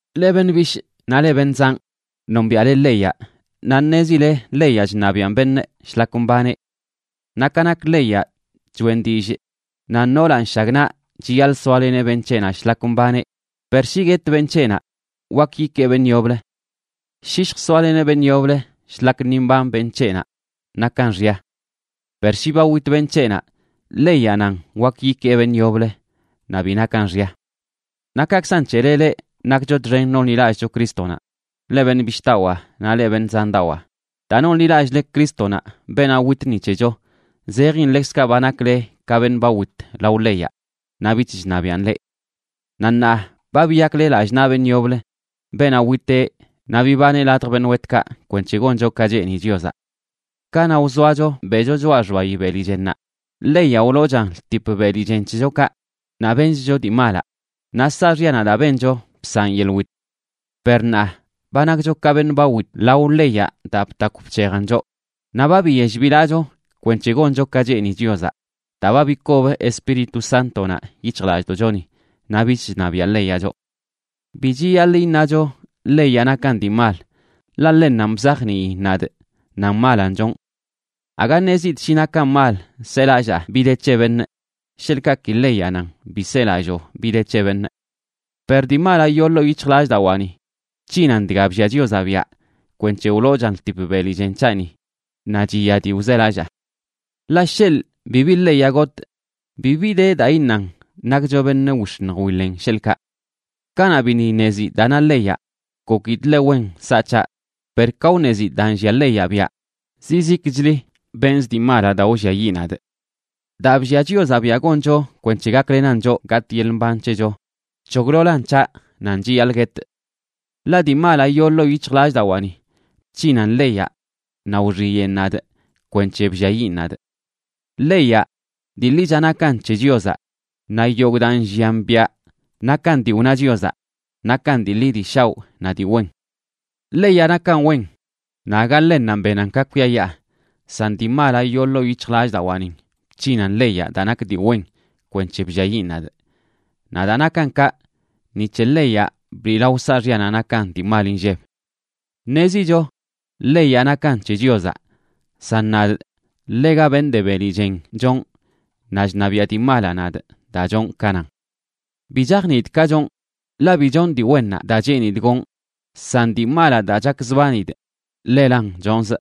Leꞌ beṉꞌ bishꞌ naꞌ leꞌ beṉꞌ zanꞌ, nombiaꞌle leyaꞌ naꞌ ṉezile leyaꞌ chṉabiꞌan beṉꞌ shlak mbaneꞌ. Naꞌ ka nak leyaꞌ, choꞌen dillꞌ nan noolaꞌ nshagnaꞌ chiyaḻꞌ soaleneꞌ beṉꞌ c̱heꞌnaꞌ shlak mbaneꞌ, per shi guet beṉꞌ c̱heꞌnaꞌ, wak yikee beṉꞌ yoblə. Shi lljsoaleneꞌ beṉꞌ yoblə shlak ni mban beṉꞌ c̱heꞌnaꞌ, nakan xya. Per shi ba wit beṉꞌ c̱heꞌnaꞌ, leyaꞌ nan wak yikee beṉꞌ yoblə, naꞌ bi nakan xya. Naꞌ kaꞌkzan c̱hele leꞌ, nakcho txen nonḻilallꞌcho Crístonaꞌ, leꞌ beṉꞌ bishꞌdawaa naꞌ leꞌ beṉꞌ zandawaa. Daa nonḻilallꞌle Crístonaꞌ, beenaꞌ wit ni c̱hecho, zejin ḻekzkaꞌ ba nakle ka beṉꞌ ba wit lao leyaꞌ naꞌ bich chṉabiꞌan leꞌ. Naꞌ ṉaa ba biyakle lallꞌ naꞌ beṉꞌ yoblə, beenaꞌ witeꞌ naꞌ bibaneꞌ ladj beṉꞌ wetkaꞌ, kwenc̱he goncho ka cheeni Chiozaꞌ. Kanaꞌ wzoacho beꞌcho choꞌa xbayi beli chennaꞌ, leyaꞌ wloochan ltip beli chen c̱hechokaꞌ naꞌ benchcho dii malaꞌ, naꞌ saaxyanaꞌ daa bencho bsaꞌn yeḻꞌ wit. Per ṉaa, ba nakcho ka beṉꞌ ba wit lao leyaꞌ daa btakw bc̱hejan choꞌ, naꞌ ba biyell bilaꞌcho kwenc̱he goncho ka cheeni Chiozaꞌ daa ba bikob Espíritu Sántonaꞌ yic̱hjlallꞌdoꞌchoni, naꞌ bich chṉabiaꞌ leyaꞌ choꞌ. Bi chiyaḻꞌ iṉacho leyaꞌ nakan dii mal. Ḻaꞌ ḻennanꞌ bzajniin nadꞌ nan malanꞌ chonꞌ. Aga ṉezidꞌ shi nakan mal selallaa bi de c̱he beṉꞌ sheḻꞌkaꞌ ki leyaꞌ nan: “Bi selalloo bi de c̱he beṉꞌ.” Per dii malaꞌ yoo ḻoo yic̱hjlallꞌdawaani bc̱hinan dga bllia Chiozaꞌ biaꞌ kwenc̱he wloochan ltip beli chen c̱haꞌni naꞌ chiya dii wzelallaa. Ḻaꞌ sheḻꞌ bibi leyaꞌ gotꞌ, bibi de daa iṉan nakcho beṉꞌ wix̱iṉj wiḻen, sheḻꞌkaꞌ. Kanaꞌ biṉꞌ iṉezidꞌ daa na leyaꞌ, gokidꞌ ḻe wen nsaꞌ c̱haꞌ, per ka wṉezidꞌ daa nllia leyaꞌ biaꞌ, zizikli benzꞌ dii malaꞌ daa wlliayiꞌ nadꞌ. Daa bllia Chiozaꞌ biaꞌ goncho kwenc̱he gaklenan choꞌ gatꞌ yeḻꞌ mban c̱hecho, bc̱hoglolan c̱haꞌ nan chiyaḻꞌ guetꞌ. Ḻaꞌ dii malaꞌ yoo ḻoo yic̱hjlallꞌdawaani bc̱hinan leyaꞌ naꞌ wxiyeꞌn nadꞌ kwenc̱he blliayiꞌn nadꞌ. Leyaꞌ dii ḻicha nakan c̱he Chiozaꞌ, naꞌ yogꞌ daa nllian biaꞌ nakan dii wna Chiozaꞌ, nakan dii ḻi dii shaoꞌ naꞌ dii wen. Leyaꞌ nakan wen naꞌ aga ḻennanꞌ benan ka kwiayaa. San dii malaꞌ yoo ḻoo yic̱hjlallꞌdawaꞌnin bc̱hinan leyaꞌ daa nak dii wen kwenc̱he blliayiꞌn nadꞌ. Naꞌ daa nakan kaꞌ, ni c̱he leyaꞌ bliꞌlao saaxyanaꞌ nakan dii mal inlleb. Ṉezicho leyaꞌ nakan c̱he Chiozaꞌ, san nadꞌ, ḻega beṉꞌ de beli chen chonꞌ, naꞌ chṉabiaꞌ dii malaꞌ nadꞌ daa chonꞌ ka nan. Bi chajniidꞌ ka chonꞌ, ḻaꞌ bi chonꞌ dii wennaꞌ daa cheenidꞌ gonꞌ, san dii malaꞌ daa chakzbanidꞌ, ḻelan chonzꞌ.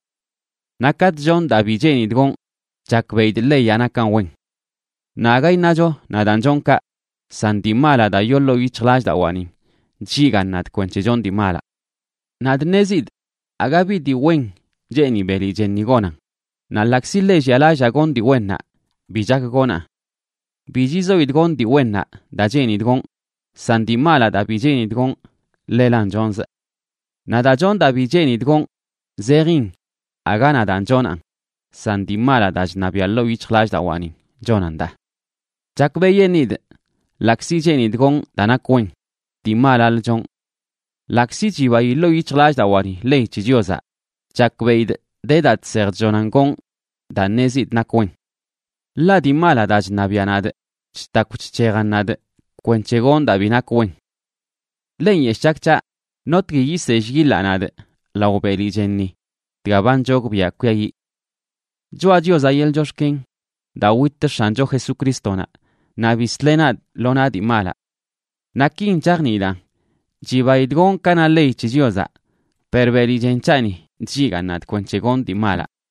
Naꞌ katꞌ chonꞌ daa bi cheenidꞌ gonꞌ, chakbeꞌidꞌ leyaꞌ nakan wen. Naꞌ aga iṉacho nadaan chonꞌ kaꞌ, san dii malaꞌ daa daa yoo ḻoo yic̱hjlallꞌdawaanin chlligaan nadꞌ kwenc̱he chonꞌ dii malaꞌ. Nadꞌ ṉezidꞌ aga bi dii wen cheeni beli chenni gonan. Naꞌ ḻaꞌkzi ḻe llialallaa gonꞌ dii wennaꞌ, bi chak gonaꞌn. Bi chizoidꞌ gonꞌ dii wennaꞌ daa cheenidꞌ gonꞌ, san dii malaꞌ daa bi cheenidꞌ gonꞌ, ḻelan chonzꞌ. Naꞌ daa chonꞌ daa bi cheenidꞌ gonꞌ, zejin aga nadaan chonaꞌn, san dii malaꞌ daa chṉabiaꞌ ḻoo yic̱hjlallꞌdawaanin chonan daa. Chakbeꞌyeṉidꞌ ḻaꞌkzi cheenidꞌ gonꞌ daa nak wen, dii malalə chonꞌ. Ḻaꞌkzi chibayi ḻoo yic̱hjlallꞌdawaani ley c̱he Chiozaꞌ, chakbeꞌidꞌ de daa chsej chllonan gonꞌ daa ṉezidꞌ nak wen, ḻaꞌ dii malaꞌ daa chṉabiaꞌ nadꞌ chtakw chc̱hejan nadꞌ kwenc̱he gonꞌ daa bi nak wen. ¡Ḻe nyeshꞌ chak c̱haꞌ! ¿Notgui yisell yiḻaꞌ nadꞌ lao beli chenni dga ba nchogbiaꞌ kwiayiꞌ? Choꞌa Chiozaꞌ yeḻꞌ chox̱ken daa wit X̱ancho Jesucrístonaꞌ naꞌ bisleꞌ nadꞌ lo naꞌ dii malaꞌ. Naꞌ kin chajniidaꞌn: chibaidꞌ gonꞌ ka na ley c̱he Chiozaꞌ, per beli chen c̱haꞌni chlligaan nadꞌ kwenc̱he gonꞌ dii malaꞌ.